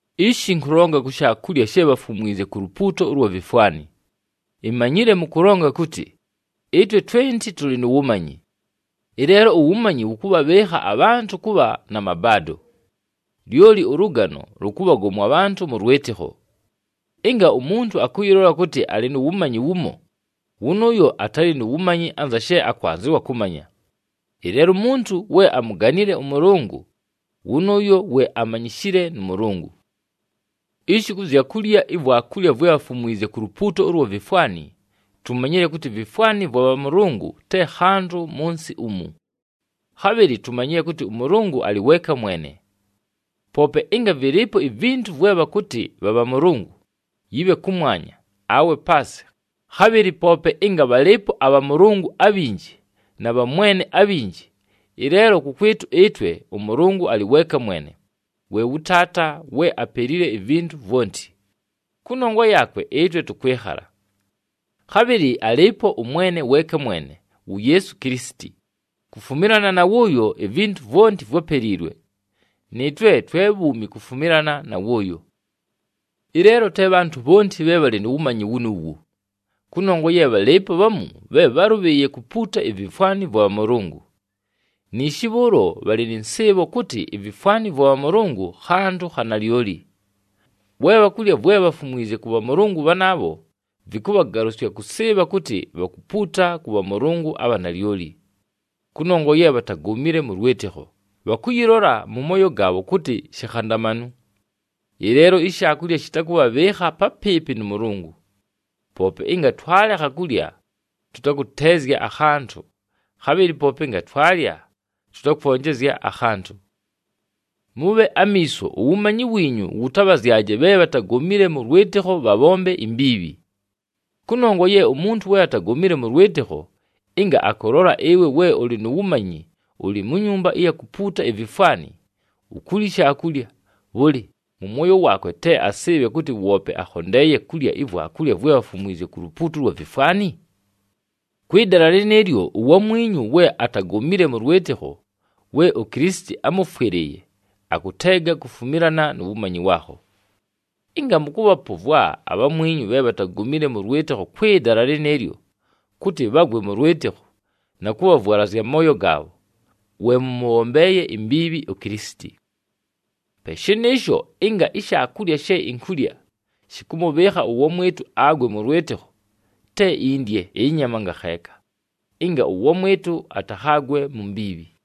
Ishi ɨnkʉlonga kʉ zya shaakulya she bhafumwizye ku lupuuto ʉlwa vifwani. Imanyile mʉkʉlonga kʉtɨ, “Ɨtwe twenti tʉlɨ nu wumanyi.” Ɨleelo uwumanyi wʉkʉbhabhɨɨkha abhantʉ kʉbha na mabaado. Lyoli ʉlʉgano lʉkʉbhagomwa abhantʉ mʉ lwɨtɨkho. Ɨnga umuntu akʉyɨlola kʉtɨ alɨ nu wumanyi wumo, wʉnʉʉyo atalɨ nu wumanyi anza she akwanzɨwa kʉmanya. Ɨleelo umuntu we amuganile ʉMʉlʉngʉ, wʉnʉʉyo we amanyishile nʉ Mʉlʉngʉ. Ishi kʉ zya kulya ivwakulya vwe bhafumwizye ku lupuuto ʉlwa vifwani, tumanyile kʉtɨ ivifwani vwa bhamʉlʉngʉ te khantʉ mʉ nsɨ umu. Khabhɨlɨ tumanyile kʉtɨ ʉMʉlʉngʉ alɨ weeka mwene. Poope ɨnga vɨlɨɨpo ivintu vwe bhakʉtɨ bha bhamʉlʉngʉ, yɨbhe kʉmwanya, awe paasɨ, khabhɨlɨ poope ɨnga bhalɨɨpo abhamʉlʉngʉ abhinji na bhamwene abhinji, ɨleelo kʉkwɨtʉ ɨtwe, ʉMʉlʉngʉ alɨ weeka mwene, we wʉ Taata, we apelile ivintu vwonti. Kʉnongwa yaakwe ɨtwe tʉkwɨkhala. Khabhɨlɨ alɨɨpo ʉMwene weeka mwene, wu Yeesu Kilisiti, kufumilana na wʉʉyo ivintu vwonti vwápeliilwe, nɨɨtwe twe bhuumi kufumilana na wʉʉyo. Ɨleelo te bhantʉ bhonti bhe bhalɨ nu wumanyi wunuuwu. Kʉnongwa ye bhalɨɨpo bhamu bhe bhálʉbhɨɨye kupuuta ivifwani vwa bhamʉlʉngʉ, niishi bhʉʉlo bhalɨ nɨ nsɨɨbho kʉtɨ ivifwani vwa bhamʉlʉngʉ khantʉ kha nalyoli. We bhakulya vwe bhafumwizye kʉ bhamʉlʉngʉ bhanaabho, vɨkʉbhagalʉsya kʉsɨɨbha kʉtɨ bhakupuuta kʉ bhamʉlʉngʉ abha nalyoli. Kʉnongwa ye bhatagomile mʉ lwɨtɨkho, bhakʉyɨlola mʉ mooyo gaabho kʉtɨ shikhandamanu. Ɨleelo ishaakulya shɨtakʉtʉbhɨɨkha papɨɨpɨ nʉ Mʉlʉngʉ. Poope ɨnga twalekha kulya, tʉtakʉteezya akhantʉ, khabhɨlɨ poope ɨnga twalya, tʉtakwonjezya akhantʉ. Mʉbhe amiiso, uwumanyi wiinyu wʉtabhazyaje bhe bhatagomile mʉ lwɨtɨkho bhabhombe imbiibhi. Kʉnongwa ye umuntu we atagomile mʉ lwɨtɨkho, ɨnga akʉlola ɨwe we ʉlɨ nu wumanyi ʉlɨ mu nyumba ɨya kupuuta ivifwani, ukulya ishaakulya, bhʉlɨ, mʉ mwoyo waakwe te asɨɨbhe kʉtɨ woope akhondeeye kulya ivwakulya vwe bhafumwizye ku lupuuto ʉlwa vifwani? Kwɨ dala lɨnɨɨlyo, uwamwinyu we atagomile mʉ lwɨtɨkho, we uKilisiti ámʉfwɨlɨɨye, akʉteega kufumilana nu wumanyi waakho. Ɨnga mʉkʉbhapʉvwa abhamwinyu bhe bhatagomile mʉ lwɨtɨkho kwɨ dala lɨnɨɨlyo, kʉtɨ bhagwe mʉ lwɨtɨkho, na kʉbhavwalazya amooyo gaabho, we mʉmʉbhombeeye imbiibhi uKilisiti. Pe shɨnɨɨsho, ɨnga ishaakulya she inkulya, shɨkʉmʉbhɨɨkha ʉwamwɨtʉ agwe mʉ lwɨtɨkho, te indye ɨnyama ngakheeka, ɨnga ʉwamwɨtʉ atakhagwɨle mu mbiibhi.